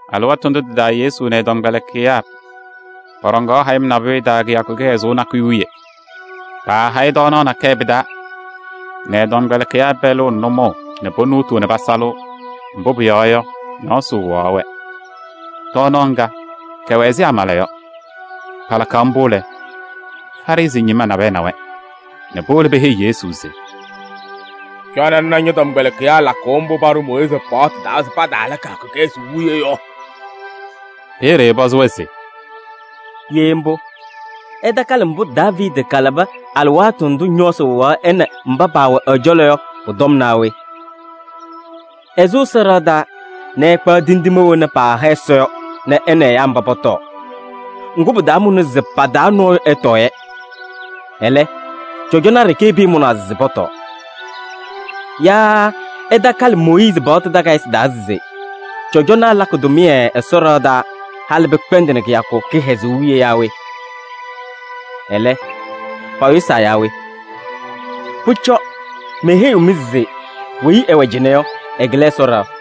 Alɩwaatʋ ndʋ tɩ-taa Yesu nɛ ɛ-tɔmkpɛlɩkɩyaa pɔɖɔŋaɣ hayɩm nabʋyʋ taa kɩyakʋ kɩhɛzʋʋ nakʋyʋ wiye. Paahayɩ tɔɔnaɣ nakɛyɛ pɩ-taa nɛ ɛ-tɔmkpɛlɩkɩyaa pɛlɩɣ nɛ nʋmɔʋ nɛ ponuutuu nɛ pasalɩɣ, mbʋ pʋyɔɔ yɔ, ñɔɔsɩ wɩɣaɣ-wɛ. Tɔɔnaɣ ŋga, kɛwɛ ɛzɩ amala yɔ. Palakaɣ mbʋ lɛ, Farɩsɩ ñɩma nabɛyɛ na-wɛ nɛ powolo peheyi Yesu se: “Cɔnɩ ŋna ñɔ-tɔmkpɛlɩkɩyaa lakʋʋ mbʋ paɖʋ Mooyiizi paɣtʋ taa se pataala kɩyakʋ kɩhɛzʋʋ wiye yɔ.” Peeye ɛpɔzɩ-wɛ se: “Ye mbʋ, ɩtakalɩ mbʋ Daaviidi kalabɩ alɩwaatʋ ndʋ ñɔɔsɩ wɩɣaɣ ɛ nɛ mba paawɛ ɛ-cɔlɔ yɔ pʋ-tɔm naa we? Ɛsʋ Ɛsɔ ɖɩɣa taa nɛ ɛkpaɣ tindine wena paaha Ɛsɔ yɔ nɛ ɛ nɛ ɛyaa mba pɔtɔɔ. Ŋgʋ, pɩtaamʋnɩ se pa-taa nɔɔyʋ ɛtɔɔ-yɛ. Ɛlɛ, cɔjɔnaa ɖeke pɩɩmʋnaa se pɔtɔɔ. Yaa ɩtakalɩ Mooyiizi paɣtʋ takayɩsɩ taa se: cɔjɔnaa lakɩ tʋmɩyɛ Ɛsɔ ɖɩɣa taa halɩ pɩkpɛndɩnɩ kɩyakʋ kɩhɛzʋʋ wiye yaa we? Ɛlɛ, payʋsaa yaa we? Pʋcɔ, meheyiɣ-mɩ se weyi ɛwɛ cɩnɛ yɔ, ɛkɩlɩ Ɛsɔ ɖɩɣa.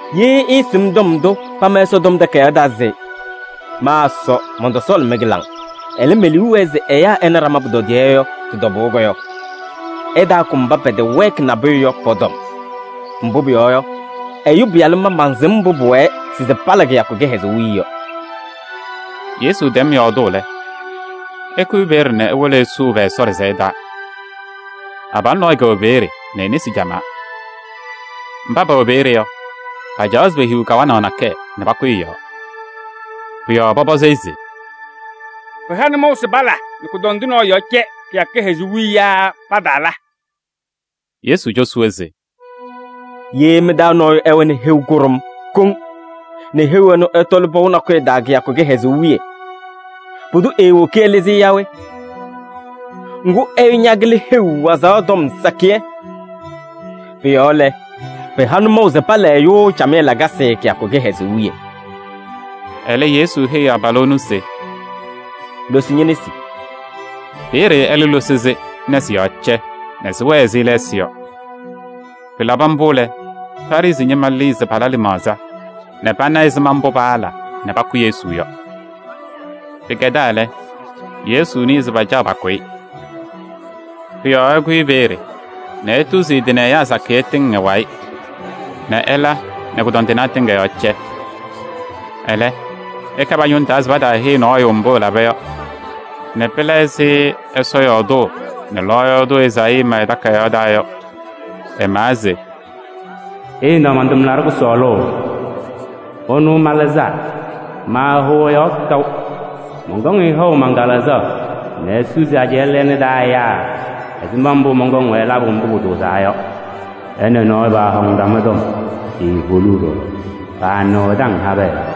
Ye ɩɩsɩm tɔm ndʋ pama Ɛsɔtɔm Takayaɣ taa se: ‘Ma Ɛsɔ mɔntɔsɔɔlɩ mɩ-kɩlaŋ. Ɛlɛ, me-liu wɛɛ se ɛyaa ɛna ɖama pʋtɔdɩyɛ’ yɔ tɩ-tɔbʋʋ yɔ, ɩtaakʋ mba pɛtɛwɛɛkɩ nabʋyʋ yɔ pɔ-tɔm. Mbʋ pʋyɔɔ yɔ, Ɛyʋ Pɩyalʋ ma mansɩm mbʋ pʋwɛɛ se pala kɩyakʋ kɩhɛzʋʋ wiye yɔ.” Yesu tɛm yɔɔdʋʋ lɛ, ɛkʋyɩ peeye nɛ ewolo ɛsʋʋ pɛ-Ɛsɔ ɖɩsɛyɛ taa. Abalʋ nɔɔyʋ kɛwɛ peeye, e-nesi camaa. Mba pɛwɛ peeye yɔ, pacaɣaɣ se pehiɣ kawanaɣ nakɛyɛ nɛ pakʋyɩ ɛ-yɔɔ. Pʋ-yɔɔ pɔpɔzɩ-ɩ se: “Pɩha nʋmɔʋ se pala nɛ kʋdɔndʋ nɔɔyʋ yɔɔ cɛ kɩyakʋ kɩhɛzʋʋ wiye yaa pataala?” Yesu cosi-wɛ se: “Ye mɩ-taa nɔɔyʋ ɛwɛnɩ heu kʋɖʋm koŋ nɛ heu ɛnʋ ɛtɔlɩ pɔʋ nakʋyʋ taa kɩyakʋ kɩhɛzʋʋ wiye, pʋdʋ eewoki ɛlɩzɩ-ɩ yaa we?” Ŋgʋ, ɛyʋ ñakɩlɩ heu wazaɣ tɔm sakɩyɛ. Pʋ-yɔɔ lɛ, pɩha nʋmɔʋ se pala ɛyʋ camɩyɛ lakasɩ kɩyakʋ kɩhɛzʋʋ wiye. Ɛlɛ Yesu heyi abalʋ ɛnʋ se: “Losi ñe-nesi!” Peeye ɛlɛ losi-sɩ nɛ sɩ-yɔɔ cɛ nɛ sɩwɛɛ ɛzɩ lɛɛsɩ yɔ. Pɩlabɩ mbʋ lɛ, Farɩsɩ ñɩma lɩɩ se pala lɩmaɣza nɛ pana ɛzɩma mbʋ paala nɛ pakʋ Yesu yɔ. Pɩkɛdaa lɛ, Yesu nɩɩ se pacaɣ pakʋ-ɩ. Pʋ-yɔɔ ɛkʋyɩ peeye nɛ etuzi ɛ-tɩ nɛ ɛyaa sakɩyɛ tɩŋ ɛ-wayɩ nɛ ɛla nɛ kʋdɔndɩnaa tɩŋa yɔɔ cɛ. Ɛlɛ, ɛka pa-ñʋŋ taa se pataaheyi nɔɔyʋ mbʋ ɛlaba yɔ nɛ pɩla ɛzɩ Ɛsɔ yɔɔdʋʋ nɛ lɔɔyaɣ tʋ Ezaayii ma ɛ-takayaɣ taa yɔ. Ɛmawa se: “Ɩna man-tʋmlaɖʋ kʋsɔɔlʋ. Ɛnʋ malɩzaa. Maahʋʋ ɛ-yɔɔ kaʋ. Mɔnkɔŋ-ɩ haʋ man-Kalɩzaɣ nɛ esusi ajɛɛ lɛɛna taa ɛyaa ɛzɩma mbʋ mɔnkɔŋ-wɛ labʋ mbʋ pʋtʋʋzaa yɔ. Ɛ nɛ nɔɔyʋ paahɔŋnɩ ɖama tɔm, eeholuu ɖɔɖɔ. Paanɩɣ ɛ-taŋ habɛɛ yɔɔ.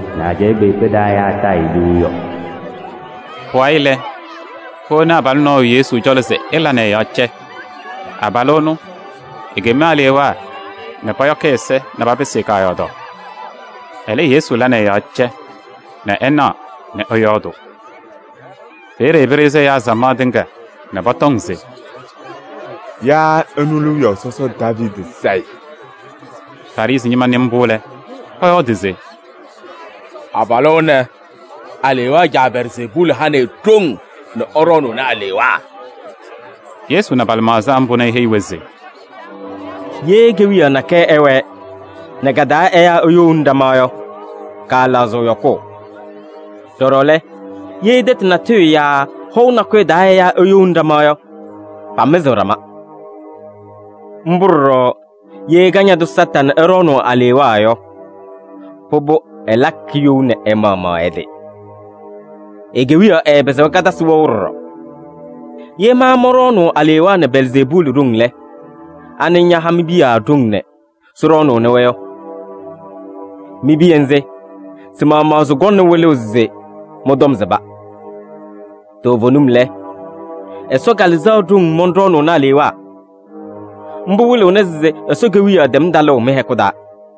nɛ ajɛɛ kpeekpe taa ɛyaa taa-ɩ liu yɔ.” Pʋwayɩ lɛ, powoni abalʋ nɔɔyʋ Yesu cɔlɔ se ɛla nɛ ɛ-yɔɔ cɛ. Abalʋ ɛnʋ, ekem alewaa nɛ pɔyɔkɩ ɛ-ɛza nɛ papɩsɩ-ɩ kaayɔɔdaɣ. Ɛlɛ Yesu la nɛ ɛ-yɔɔ cɛ nɛ ɛnaɣ nɛ ɛyɔɔdʋʋ. Peeye pɩɖɩɣzɩ ɛyaa samaɣ tɩŋa nɛ pɔtɔŋ se: “Yaa ɛnʋ lɛ wiyaʋ sɔsɔ Daaviidi Sayɩ?” Farɩsɩ ñɩma nɩ mbʋ lɛ, pɔyɔɔdɩ se: “Abalʋ ɛnɛ, alewaa caa Belzeebuuli hanɩ-ɩ ɖoŋ nɛ ɛɖɔɔnʋʋnɩ alewaa.” Yesu na pa-lɩmaɣza mbʋ nɛ eheyi-wɛ se: “Ye kewiyaɣ nakɛyɛ ɛwɛɛ nɛ ka-taa ɛyaa eyouni ɖama yɔ, kaalaɣzɩɣ yɔkʋʋ. Ɖɔɖɔ lɛ, ye tɛtʋ natʋyʋ yaa hɔʋ nakʋyʋ taa ɛyaa eyouni ɖama yɔ, pamɩzɩɣ ɖama. Mbʋ ɖɔɖɔ ye Kañadʋ Satanɩ ɛɖɔɔnʋʋ alewaa yɔ, pʋbʋ ɛlakɩ you nɛ ɛ-maɣmaɣ ɛ-tɩ. E-kewiyaɣ ɛɛpɩzɩɣ katasɩ wɛʋ ɖɔɖɔ. Ye ma mɔnɖɔɔnʋʋ alewaa nɛ Belzeebuuli ɖoŋ lɛ, anɩ ñaha mi-piya ɖoŋ nɛ sɩɖɔɔnʋʋnɩ-wɛ yɔ? Mi-piya nzɩ, sɩ-maɣmaɣ sɩkɔŋna wɩlʋʋ se mɩ-tɔm sɩba. Toovenim lɛ, Ɛsɔ Kalɩzaɣ ɖoŋ mɔnɖɔɔnʋʋnɩ alewaa. Mbʋ wɩlɩɣna se Ɛsɔ Kewiyaɣ tɛm talʋʋ mɩ-hɛkʋ taa.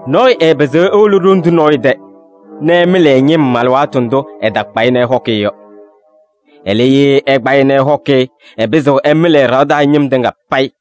“Nɔɔyʋ ɛɛpɩzɩɣ ewolo ɖoŋ tʋ nɔɔyʋ tɛ nɛ ɛmɩlɩ ɛ-ñɩm alɩwaatʋ ndʋ ɛtakpa-ɩ nɛ ɛhɔkɩ-ɩ yɔ. Ɛlɛ, ye ɛkpa-ɩ nɛ ɛhɔkɩ-ɩ yɔ, ɛpɩzɩɣ ɛmɩlɩ ɛ-ɖɩɣa taa ñɩm tɩŋa payɩ.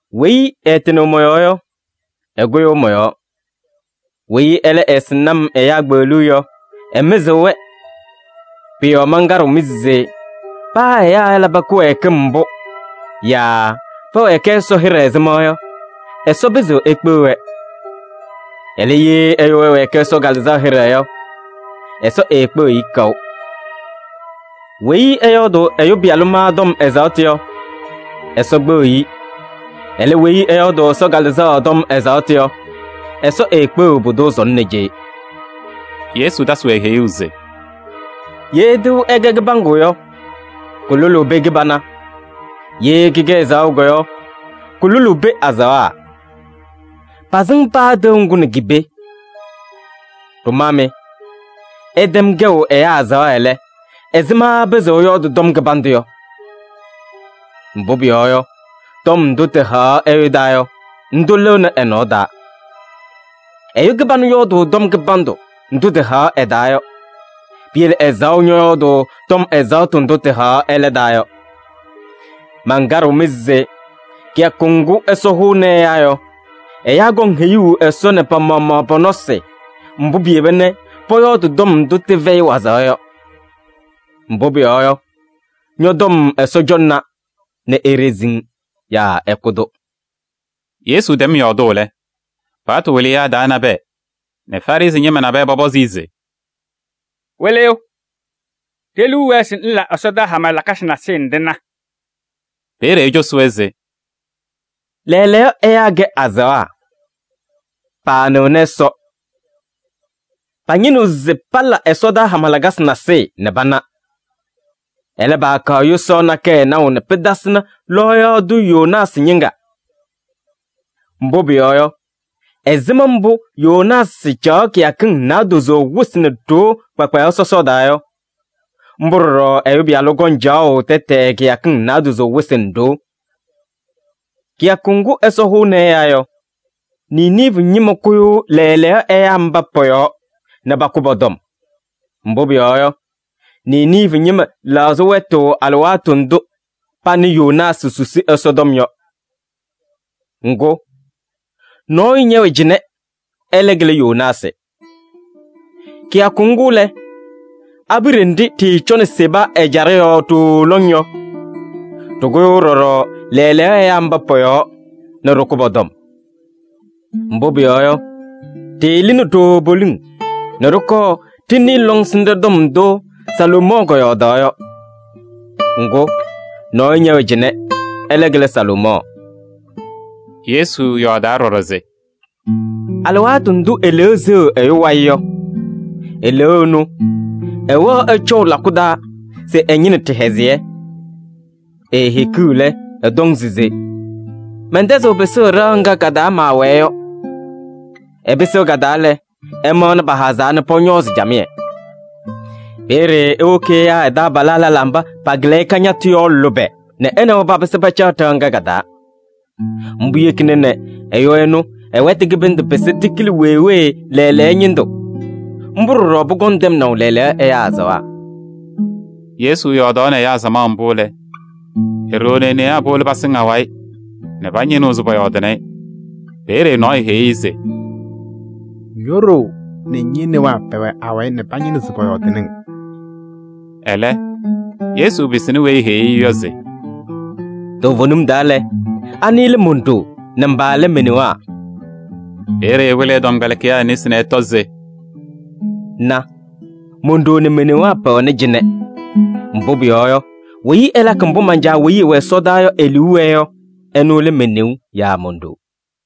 “Weyi ɛɛtɩnɩɣ mɔ-yɔɔ yɔ, ɛkʋyʋʋ mɔ-yɔɔ. Weyi ɛlɛ ɛɛsɩŋnɩ-m ɛyaa kpeɣluu yɔ, ɛmɩzɩɣ-wɛ. Pʋ-yɔɔ mankaɖɩɣ-mɩ se paa ɛyaa ɛlabɩ kɩwɛɛkɩm mbʋ yaa pɛwɛɛkɩ Ɛsɔ hɩɖɛ ɛzɩma yɔ, Ɛsɔ pɩzɩɣ ekpeɣ-wɛ. Ɛlɛ, ye ɛyʋ ɛwɛɛkɩ Ɛsɔ Kalɩzaɣ hɩɖɛ yɔ, Ɛsɔ eekpeɣiɣ-i kaʋ. Weyi ɛyɔɔdʋʋ Ɛyʋ Pɩyalʋ ma tɔm ɛzaɣtʋ yɔ, Ɛsɔ kpeɣiɣ-i. Ɛlɛ, weyi ɛyɔɔdʋʋ Ɛsɔ Kalɩzaɣ tɔm ɛzaɣtʋ yɔ, Ɛsɔ eekpeɣiɣ pʋdʋ sɔnɔ nɛ cee.” Yesu tasɩ-wɛ heyuu se: “Ye tɩʋ ɛkɛ kɩbaŋgʋ yɔ, kʋlʋlʋʋ pee kɩbana. Ye kɩkɛ ɛzaɣʋ yɔ, kʋlʋlʋʋ pee azaɣa: pasɩŋ paa tɩʋ ŋgʋ nɛ ki-pee. Ɖʋmaa mɩ! Ɩtɛm kɛʋ ɛyaa azaɣa lɛ, ɛzɩma ɩpɩzɩɣ ɩyɔɔdɩ tɔm kɩbandʋ yɔ? Mbʋ pʋyɔɔ yɔ, tɔm ndʋ tɩhaɣ ɛyʋ taa yɔ, ndʋ lɩɣnɩ ɛ-nɔɔ taa. Ɛyʋ kɩbanʋ yɔɔdʋʋ tɔm kɩbandʋ ndʋ tɩhaɣ ɛ-taa yɔ. Piyele ɛzaɣʋ ñɔyɔɔdʋʋ tɔm ɛzaɣtʋ ndʋ tɩhaɣ ɛlɛ taa yɔ. Mankaɖɩɣ-mɩ se kɩyakʋ ŋgʋ Ɛsɔ hʋʋnɩ ɛyaa yɔ, ɛyaa kɔŋ heyuu Ɛsɔ nɛ pa-maɣmaɣ pɔ-nɔsɩ mbʋ piyeba nɛ pɔyɔɔdɩ tɔm ndʋ tɩfɛyɩ wazaɣ yɔ. Mbʋ pʋyɔɔ yɔ, ñɔ-tɔm Ɛsɔ cɔŋna nɛ eɖezi-ŋ yaa ɛkʋ-tʋ.” Yesu tɛm yɔɔdʋʋ lɛ, paɣtʋ wɩlɩyaa taa nabɛyɛ nɛ Farɩsɩ ñɩma nabɛyɛ pɔpɔzɩ-ɩ se: “Wɩlɩyʋ! Ɖe-liu wɛɛ se ŋla ɛsɔdaa hama lakasɩ nasɩyɩ nɛ ɖɩna.” Peeye ecosi-wɛ se: “Lɛɛlɛɛyɔ ɛyaa kɛ azaɣa, paanɩɣnɩ Ɛsɔ. Pañɩnɩɣ se pala ɛsɔdaa hama lakasɩ nasɩyɩ nɛ pana. Ɛlɛ, paakaɣ yʋsaɣ nakɛyɛ naʋ nɛ pɩtasɩnɩ lɔɔyaɣ tʋ Yoonaasɩ ñɩŋga. Mbʋ pʋyɔɔ yɔ, ɛzɩma mbʋ Yoonaasɩ caɣ kɩyakɩŋ naadozo wɩsɩ nɛ ɖoo kpakpayaɣ sɔsɔɔ taa yɔ, mbʋ ɖɔɖɔ Ɛyʋ Pɩyalʋ kɔŋ caɣʋ tɛtɛɛ kɩyakɩŋ naadozo wɩsɩ nɛ ɖoo. Kɩyakʋ ŋgʋ Ɛsɔ hʋʋnɩ ɛyaa yɔ, Niniivi ñɩma kʋyʋʋ lɛɛlɛɛyɔ ɛyaa mba pɔ-yɔɔ nɛ pakʋ pɔ-tɔm. Mbʋ pʋyɔɔ yɔ, Niniivi ñɩma lɛɣzɩ wɛtʋ alɩwaatʋ ndʋ panɩ Yoonaasɩ susi Ɛsɔtɔm yɔ. Ŋgʋ, nɔɔyʋ ñɛwɛ cɩnɛ, ɛlɛ kɩlɩ Yoonaasɩ! Kɩyakʋ ŋgʋ lɛ, abiɖe nɖɩ ɖɩɩcɔnɩ Seba ɛjaɖɛ yɔɔ ɖooo lɔŋ yɔ, ɖɩkʋyʋʋ ɖɔɖɔ lɛɛlɛɛyɔ ɛyaa mba pɔ-yɔɔ nɛ ɖɩkʋ pɔ-tɔm. Mbʋ pʋyɔɔ yɔ, ɖɩɩlɩnɩ ɖooo poliŋ nɛ ɖɩkɔɔ ɖɩnɩɩ lɔŋsɩnɖɛ tɔm ndʋ Salomɔɔ kɔyɔɔdaɣ yɔ. Ŋgʋ, nɔɔyʋ ñɛwɛ cɩnɛ, ɛlɛ kɩlɩ Salomɔɔ!” Yesu yɔɔdaa ɖɔɖɔ se: “Alɩwaatʋ ndʋ eleeu seɣ ɛyʋ wayɩ yɔ, eleeu ɛnʋ ɛwɛɣ ɛcɔʋ lakʋ taa se ɛñɩnɩ ɖɩhɛzɩyɛ. Eehikiɣ lɛ, ɛtɔŋ se: ‘Mɛntɛzɩɣ pɩsʋʋ ɖɩɣa ŋga ka-taa maawɛɛ yɔ.’ Ɛpɩsɩɣ ka-taa lɛ, ɛmaɣnɩ pahazaa nɛ pɔñɔɔzɩ camɩyɛ. Peeye ewoki ɛyaa ɛ-taabalaa lɛlaa mba pakɩlɩ-ɩ kañatʋ yɔ lʋbɛ nɛ ɛ nɛ wɛ papɩsɩ pacaɣ ɖɩɣa ŋga ka-taa. Mbʋ yekina nɛ ɛyʋ ɛnʋ ɛ-wɛtʋ kɩbɩndʋ pɩsɩ tɩkɩlɩ wee wee lɛɛlɛɛyɔ ñɩndʋ. Mbʋ ɖɔɖɔ pʋkɔŋ tɛmnaʋ lɛɛlɛɛyɔ ɛyaa azaɣa.” Yesu yɔɔdaɣnɩ ɛyaa samaɣ mbʋ lɛ, e-ɖoo nɛ e-newaa powolo pasɩŋ awayɩ nɛ pañɩnɩɣ se pɔyɔɔdɩnɩ-ɩ. Peeye nɔɔyʋ heyi-i se: “Ño-ɖoo nɛ ñe-newaa pɛwɛ awayɩ nɛ pañɩnɩɣ se pɔyɔɔdɩnɩ-ŋ.” Ɛlɛ, Yesu pɩsɩnɩ weyi eheyi-i yɔ se: “Toovenim taa lɛ, anɩ lɛ mon-ɖoo nɛ mba lɛ me-newaa?” Peeye ɛwɩlɩ ɛ-tɔmkpɛlɩkɩyaa nesi nɛ ɛtɔ se: “Na! Mon-ɖoo nɛ me-newaa pɛwɛnɩ cɩnɛ. Mbʋ pʋyɔɔ yɔ, weyi ɛlakɩ mbʋ man-Caa weyi ɛwɛ ɛsɔdaa yɔ e-liu wɛɛ yɔ, ɛnʋ lɛ me-neu yaa mon-ɖoo.”